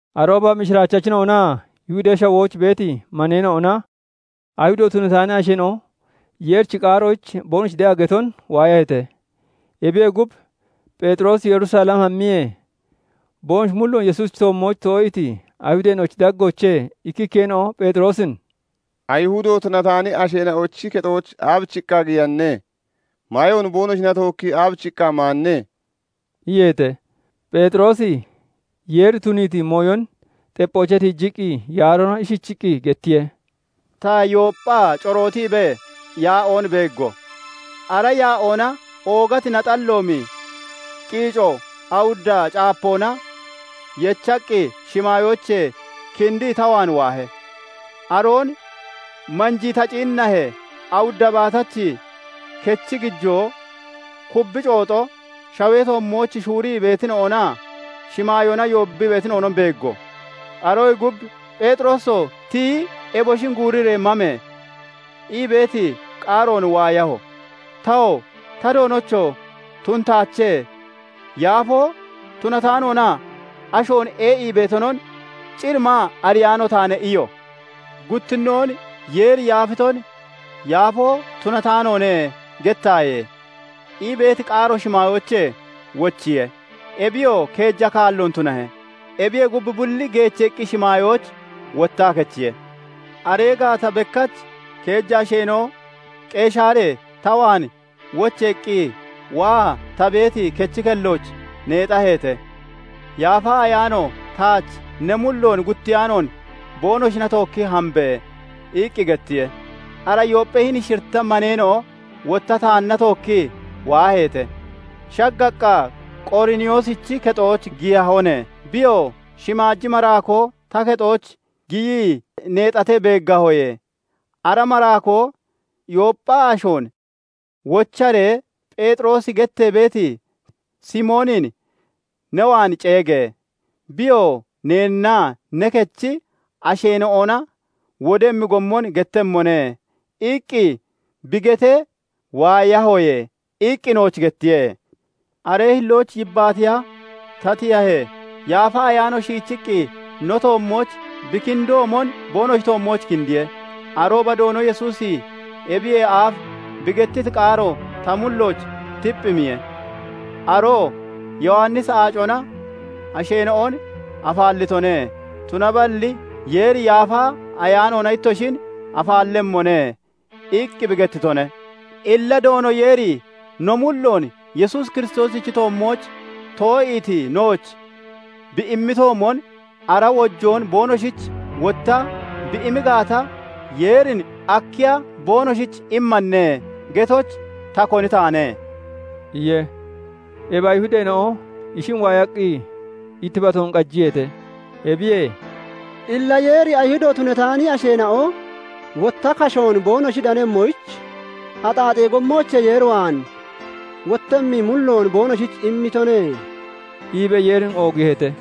Arooba mishiraachachina'onaa Yihudee Shawooch beeti maneena'ona Ayihudo tunataani asheena'o Yeerichi qaaroyich boonoshi de'a geton waayaheete. Ebiyee gub, Pheexiroosi Yerusalem hammiyee, boonoshi mulloon Yesuusichi toommooch too'iiti Ayihudeena'ochi daggoochee ikkikkeena'o Pheexiroosin "Ayihudo tunataani asheena'ochi kexooch aabichiqqa giyanne? Maayoon boonoshina tookkii aabichiqqa maanne?" iyeete. Pheexiroosi Yeeri tuniiti mooyon xepphoochee tiijiqqi yaaroona ishichiqqi gettiye:- "Ta, Yoopphaa corootiibee yaa'oon beeggo. Ara yaa'oona oogati naxalloomi qiico awudda caapoona yechaqqi, shimaayoochee kindii ta waan waahe. Aroon manjii ta ciinnahee, awudda baatachi kechi gijoo, kubbi cooxo, shawee toommooch shuurii beetina'onaa shimaayoona yoobbii beetina'onon beeggo. Aroyee gub, 'Pheexirooso! Tiyi eboshin guuriree mame!' ii beeti qaaroon waayaho. "Tawoo 'Ta Doonocho! Tunataache! Yaafoo tunataanoonaa ashoon ee'ii beetonon cir maa ariyaano taane' iyo. "Guttinnoon 'Yeeri yaafiton "Yaafoo tunataanoone" gettaaye!' ii beeti qaaro shimaayoochee wochiye. Ebiyoo keeja kaalloon tunahe. Ebiyee gub, bulli geecheeqqi shimaayooch wottaa kechiye. "Aree gaata bekkach keeja asheena'o Qeshaaree ta waan wocheeqqi, waa ta beeti kechi kellooch neexaheete. Yaafa Ayaano taach 'Ne mulloon guttiyaanoon boonoshina tookki hambe!' iqqi gettiye. Ara Yoopphee hini shiritta maneena'o wotta taanna tookkii waaheete; shaggaqqa Qoriniyoosichi kexooch giyahone. Biyoo 'Shimaaji maraakoo ta kexooch giyii neexatee beeggahoye; ara maraakoo "Yooppha ashoon wocharee Pheexiroosi gettee beeti Simoonin ne waan ceege! Biyoo neennaa ne kechi asheena'ona wodemmi gommon gettemmone" iqqi bi getee waayahoye' iqqi nooch gettiye. "Aree hillooch yibbaatiya ta tiyahee, Yaafa Ayaano shiichiqqi no toommooch bi kindoomon boonoshi toommooch kindiye. Arooba Doono Yesuusi ebiyee aaf bi gettiti qaaro ta mullooch tipphimiye; aroo 'Yowannisi aacona asheena'on afaallitone; tunaballi Yeeri Yaafa Ayaanoona ittoshin afaallemmone' iqqi bi gettitone. Illa Doono Yeeri no mulloon Yesuus Kiristoosichi toommooch too'iiti nooch bi immitoomon ara wojoon boonoshich wotta bi imi gaata, Yeerin 'Akkiya boonoshich immanne?' getoyich ta koni taane?" iye. Ebi Ayihudeena'o ishin waayaqqi ittibatoon qajiyeete. Ebiyee "Illa Yeeri Ayihudo tunataani asheena'o wotta kashoon boonoshi danemmoyich, axaaxee gommoochee Yeer waan wottemmi mulloon boonoshich immitone" iibee Yeerin oogiiheete.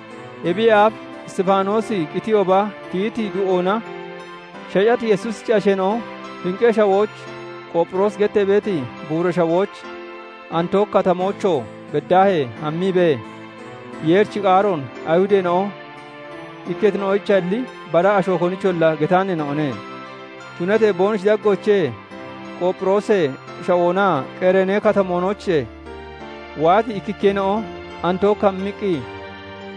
Ebiyee aaf Isxifaanoosi qitiyooba, tiyiti du'oona shacati Yesuusichi asheena'o Finqee Shawooch, Qoopphiroosi gettee beeti buura shawooch, Antooki Katamoochoo beddaahee hammiibee, Yeerichi qaaroon Ayihudeena'o ikketina'oyichalli bara asho konicholla getaaneena'one. Tunatee boonoshi daggoochee Qoopphiroosee Shawoonaa Qereeni Katamoonoochee waati ikkikkeena'o Antook hammiqqi,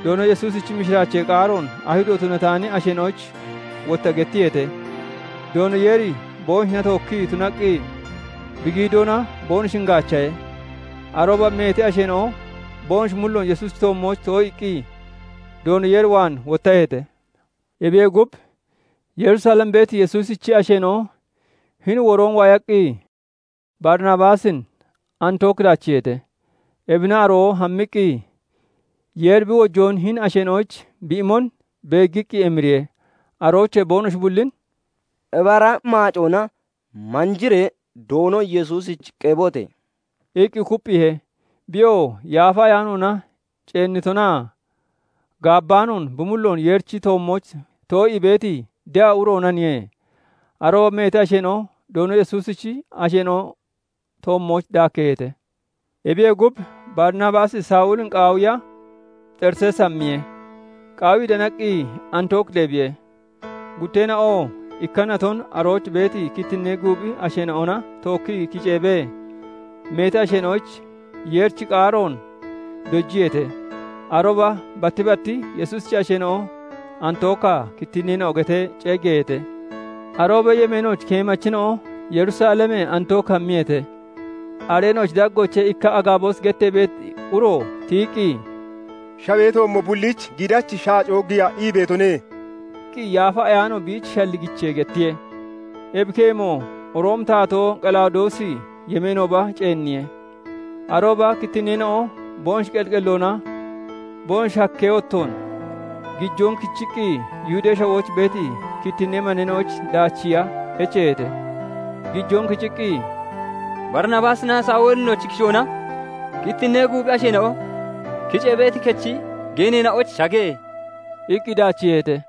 Doono Yesuusichi mishiraachee qaaroon Ayihudo tunataani asheena'oyich wotta gettiyeete. Doono Yeeri boonoshina tookkii tunaqqi bi giidoona boonoshin gaachahe; arooba meeti asheena'o boonoshi mulloon Yesuusichi toommooch too'iiqqi Doono Yeer waan wottaheete. Ebiyee gub, Yerusalem beeti Yesuusichi asheena'o hini woroon waayaqqi, Barinabaasin Antook daachiiheete; ebina aroo hammiqqi Yeeri bi wojoon hini asheena'oyich bi imon beeggiqqi emiriye; aroochee boonoshi bullin "Ibara maacoona manjiree Doono Yesuusich qebote!" iqqi kupphiihe. Biyoo Yaafa Ayaanoona ceennitonaa gaabbaanoon bi mulloon Yeerichi toommooch too'ii beeti de'a uroonaniye. Arooba meeti asheena'o Doono Yesuusichi asheena'o toommooch daakkeeheete. Ebiyee gub, Barinabaasi Sawulin qaawiya, Xerisees hammiye; qaawii danaqqi Antook deebbiye. Gutteena'oo ikka naton arooch beeti kittinnee guuphi asheena'ona tookkii kiceebee, meeti asheena'oyich Yeerichi qaaroon dojiyeete. Arooba batti bat Yesuusichi asheena'o Antookaa kittinneena'o getee ceeggeeheete. Aroobee yemeenooch keemachina'o Yerusalemee Antook hammiyeete. Areena'ochi daggoochee ikka Agaaboosi gettee beeti uro tiyiqqi, "Shawee toommo bulliich giidachi shaacoo giya ii beetone" iqqi Yaafa Ayaano biich shalligichee gettiye. Ebi keemo Roomi taatoo Qalawudoosi yemeenooba ceenniye. Arooba kittinneena'o boonoshi qelli qelloona boonoshi hakkee wottoon gijoon kichiqqi, Yihudee Shawooch beeti kittinnee maneena'oyich daachiiya echeeheete. Gijoon kiciqqi, "Barinabaasinaa Sawulinochi kishoona kittinnee guuphi asheena'o kicee beeti kechi geeneena'oyich shage!" iqqi daachiiheete.